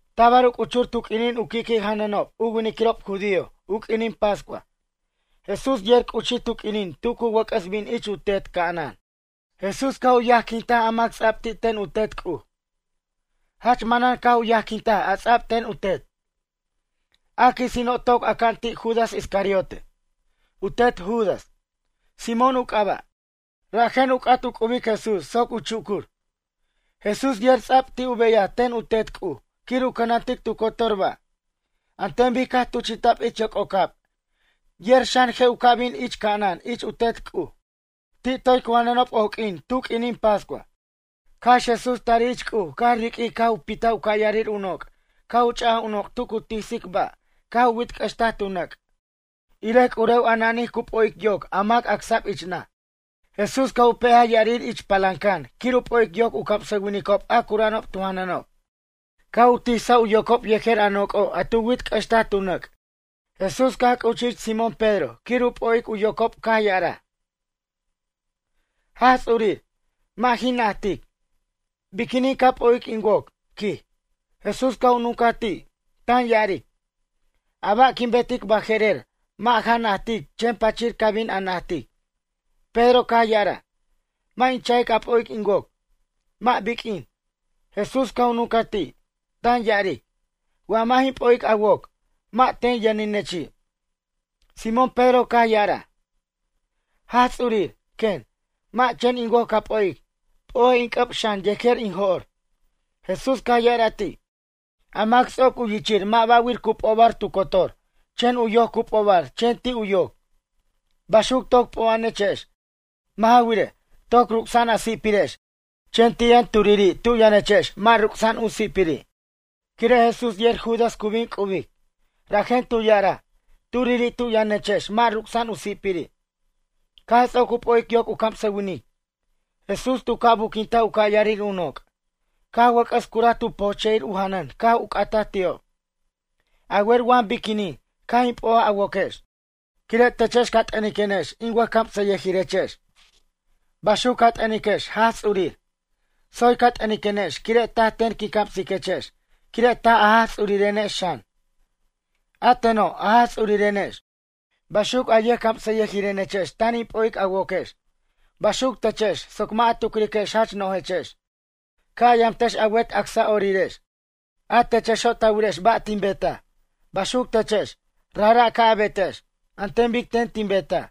Tabar u c'uchur tu q'uinin u qui'qui' janʌnob u winiquirob judío u q'uinin pascua. Jesús yer c'uchij tu q'uinin ti' cu wʌc'ʌs bin ich u Tet ca'anan. Jesús caj u yajquintaj a mac ts'a'b ti' ten u Tet C'uj. Jach manan caj u yajquintaj a ts'a'b ten u Tet. A quisino' toc aca'an ti' Judas Iscariote. U tet Judas, Simón u c'aba'. Rajen u c'at u c'ubic Jesús soc u chucur. Jesús yer ts'a'b ti' u beyaj ten u Tet C'uj quir u cʌnantic tu cotor ba'. An ten bic caj tuchi'ta'b ich yoc'ocab yer xan je' u ca' bin ich ca'anan ich u Tet C'uj. Ti' toy cu janʌnob oq'uin tu q'uinin pascua. Cax Jesús tarij ich C'uj caj riq'uij caj u pitaj u ca' yarir u noc' caj u ch'aj u noc' tu cu tisic ba' caj u wit'c'ʌxtaj tu nʌc', irej c'urew a nanij cu p'o'ic yoc a mac acsa'b ich naj. Jesús caj u pe'aj ya'arir ich palancan quir u p'o'ic yocob u camsʌwinicob a cura'anob tu janʌnob. Caj u tisaj u yocob yejer a noc'o' a tu wit'c'ʌxtaj tu nʌc'. Jesús caj c'uchij ich Simón Pedro quir u p'o'ic u yocob caj ya'araj: ―Jaj Ts'urir, mʌ' jin najtic. Biquinin ca p'o'ic in woc? ―quij. Jesús caj u nuncaj ti', tan ya'aric: ―A ba' quin betic baje'rer mʌ' ja najtic chen pachir ca bin a najtic. Pedro caj ya'araj: ―Mʌ' in cha'ic a p'o'ic in woc, mʌ' biq'uin. Jesús caj u nuncaj ti', tan ya'aric: ―Wa mʌ' jin p'o'ic a woc, mʌ' ten yʌninechi'. Simón Pedro caj ya'araj: ―Jaj Ts'urir, quen, mʌ' chen in woc ca p'o'ic, p'o'ej in c'ʌb xan yejer in jo'r. Jesús caj ya'araj ti': ―A mac ts'oc u yichir mʌ' ba'wir cu p'obar tu cotor chen u yoc cu p'obar chen ti' u yoc. Baxuco' toc p'o'a'anechex. Mʌ' ja wirej, toc ruc'sa'an a si'pirex chen ti' yʌn turiri' tu yʌnechex mʌ' ruc'sa'an u si'piri'. Quire' Jesús yer Judas cu bin c'ubic, rajen tu ya'araj: “Turiri' tu' yʌnechex mʌ' ruc'sa'an u si'piri'.” Caj ts'oc u p'o'ic yoc u camsʌwinic, Jesús tu ca' buquintaj u ca'yarir u noc'. Caj wʌc'ʌs cura tu po'che'ir u janʌn caj u c'ataj ti'ob: ―A wer wa biquinin caj in p'o'aj a woquex? Quire' techex ca t'ʌniquenex in wʌjcamsayʌjirechex, baxuc ca t'ʌniquenex Jaj Ts'urir. Tsoy ca t'ʌniquenex quire' taj ten tin camsiquechex quire' taj a Jaj Ts'urirenex xan. A teno' a Jaj Ts'urirenex, baxuc a yʌjcamsʌyʌjirenechex tan in p'o'ic a woquex. Baxuc techex soc mʌ' a tucriquex jach no'jechex, ca' a yamtex a wet acsa'orirex. A techexo' ta wirex ba' tin betaj, baxuc techex, rajra' ca' a betex, an ten bic ten tin betaj.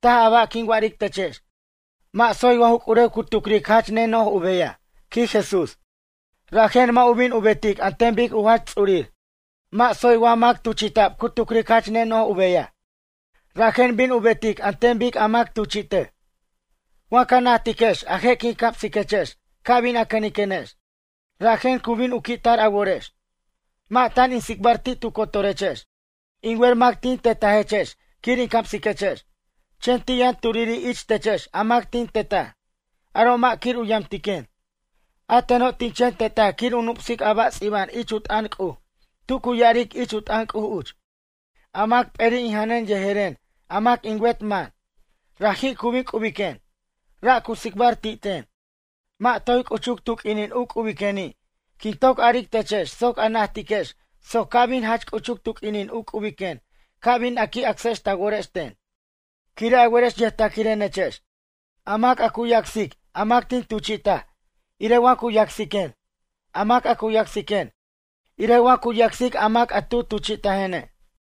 Taj a ba' quin wa'aric techex, mʌ' tsoy wa ju c'urew cu tucric jach neno'j u beyaj ―quij Jesús―, rajen mʌ' u bin u betic an ten bic u jach ts'urir. Mʌ' tsoy wa mac tuchi'ta'b cu tucric jach neno'j u beyaj. Rajen bin u betic an ten bic a mac tuchi'tej. Wa ca najtiquex a je' quin camsiquechex ca bin a cʌniquenex. Rajen cu bin u qui' tar a worex. ’Mʌ' tan in tsicbar ti' tu cotorechex. In wer mac tin tetajechex quir in camsiquechex. Chen ti' yʌn turiri' ich techex a mac tin tetaj, aro' mʌ' quir u yamtiquen. A teno' tin chen tetaj quir in nup'sic a ba' ts'iba'an ich u t'ʌn C'uj tu cu ya'aric ich u t'ʌn C'uj uch: “A mac p'eri' in janʌn yejeren a mac in wet man. Raji' cu bin u c'ubiquen.” Ra' cu tsicbar ti' ten. Mʌ' toy c'uchuc tu q'uinin u c'ubiqueni' quin toc aric techex soc a najtiquex soc ca' bin jach c'uchuc tu q'uinin u c'ubiquen ca' bin a qui' acsex ta worex ten. Quire' a werex yʌjtaquirenechex. A mac a cu yacsic a mac tin tuchi'taj, irej wa cu yacsiquen. A mac a cu yacsiquen, irej wa cu yacsic a mac a tu tuchi'tajene'.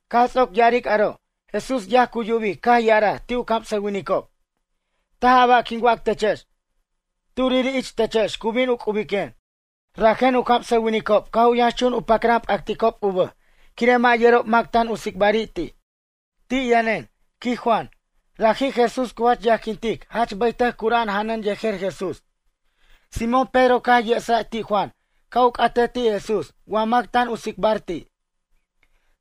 Caj ts'oc ya'aric aro' Jesús yaj cu yubic caj ya'araj ti' u camsʌwinicob: ―Taj a ba' quin wac techex, turiri' ich techex cu bin u c'ubiquen. Rajen u camsʌwinicob caj u yʌnxchun u pacran pʌcticob u bʌj quire' mʌ' yerob mac tan u tsicbari' ti'. Ti' yʌnen, quij Juan, raji' Jesús cu jach yajquintic jach bʌytʌc cura'an janʌn yejer Jesús. Simón Pedro caj yesaj ti' Juan ca' u c'atej ti' Jesús wa mac tan u tsicbar ti'.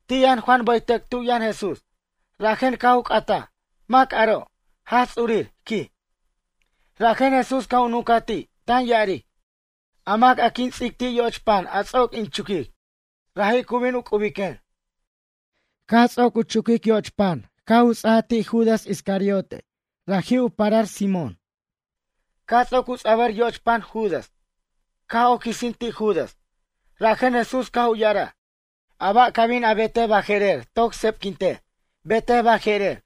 Ti' yʌn Juan bʌytʌc tu' yʌn Jesús, rajen caj u c'ataj: ―Mac aro'? Jaj Ts'urir ―quij. Rajen Jesús caj u nuncaj ti', tan ya'aric: ―A mac a quin ts'ic ti' yoch pan a ts'oc in chuquic, raji' cu bin u c'ubiquen. Caj ts'oc u chuquic yoch pan caj u ts'aj ti' Judas, raji' u tet Judas Simón Iscariote. Caj ts'oc u ts'abʌr yoch pan Judas, caj oc quisin ti' Judas. Rajen Jesús caj u ya'araj: ―A ba' ca bin a betej baje'rer toc sebquintej, betej baje'rer.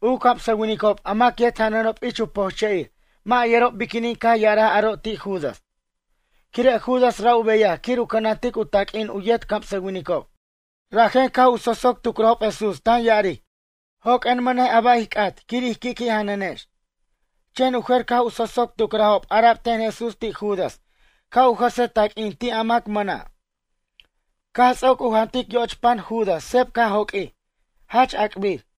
U camsʌwinicob a mac yet janʌnob ich u pojche'ir mʌ' yerob biquinin caj ya'araj aro' ti' Judas. Quire' Judas ra' u beyaj quir u cʌnantic u taq'uin u yet camsʌwinicob, rajen caj u sosoc tucrajob Jesús tan ya'aric: ―Joq'uen mʌnej a ba' ij c'at quir ij qui'qui' janʌnex. Chen u jer caj u sosoc tucrajob ara'b ten Jesús ti' Judas ca' u jʌsej taq'uin ti' a mac mʌna'. Caj ts'oc u jantic yoch pan Judas sep caj joq'uij, jach ac'bir.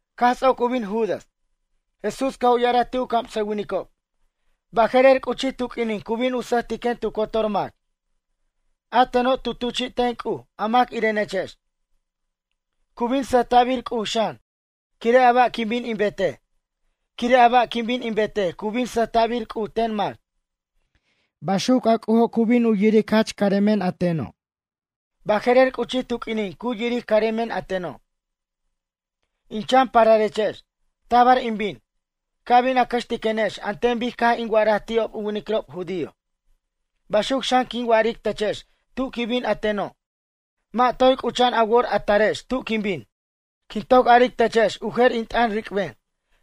Caj ts'oc u bin Judas, Jesús caj u ya'araj ti' u camsʌwinicob: ―Baje'rer c'uchij tu q'uinin cu bin u sʌjtiquen tu cotor mac. A teno' tu tuchi' ten C'uj a mac irenechex. Cu bin sʌjta'bir C'uj xan quire' a ba' quin bin in betej. Quire' a ba' quin bin in betej cu bin sʌjta'bir C'uj ten mac. Baxuc a C'ujo' cu bin u yiric jach caremen a teno'. Baje'rer c'uchij tu q'uinin cu yiric caremen a teno'. In chan pararechex, tabar in bin, ca' bin a cʌxtiquenex an ten bic caj in wa'araj ti'ob u winiquirob judío. Baxuc xan quin wa'aric techex tu' quin bin a teno', mʌ' toy c'ucha'an a wor a tarex tu' quin bin. Quin toc aric techex u jer in t'ʌn ric'ben.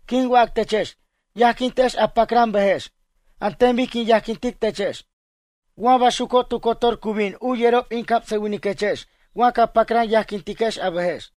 Quin wac techex: Yajquintex a pacran bʌjex. An ten bic quin yajquintic techex. Wa baxuco' tu cotor cu bin u yerob in camsʌwiniquechex wa ca pacran yajquintex a bʌjex.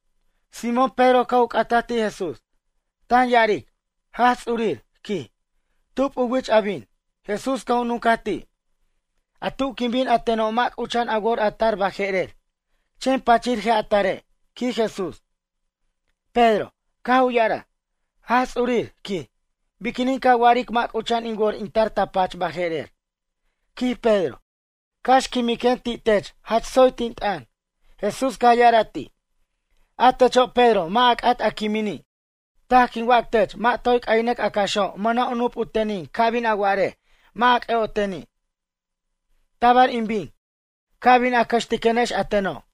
Simón Pedro caj u c'ataj ti' Jesús, tan ya'aric: ―Jaj Ts'urir ―quij―, tub u wich a bin? Jesús caj u nuncaj ti': ―A tu' quin bin a teno' mʌ' c'ucha'an a wor a tar baje'rer. Chen pachir je' a tare' ―quij Jesús. Pedro, caj u ya'araj: ―Jaj Ts'urir ―quij―, biquinin ca wa'aric mʌ' c'ucha'an in wor in tar ta pach baje'rer? ―quij Pedro―. Cax quimiquen ti' tech jach tsoy tin t'ʌn. Jesús caj ya'araj ti': ―A techo' Pedro mʌ' a c'at a quimini', taj quin wac tech mʌ' toy c'aynʌc a caxo' mʌna' u nup u tenin ca' bin a wa'arej mʌ' a c'ʌ'oteni'. Tabar in bin, ca' bin a cʌxtiquenex a teno'.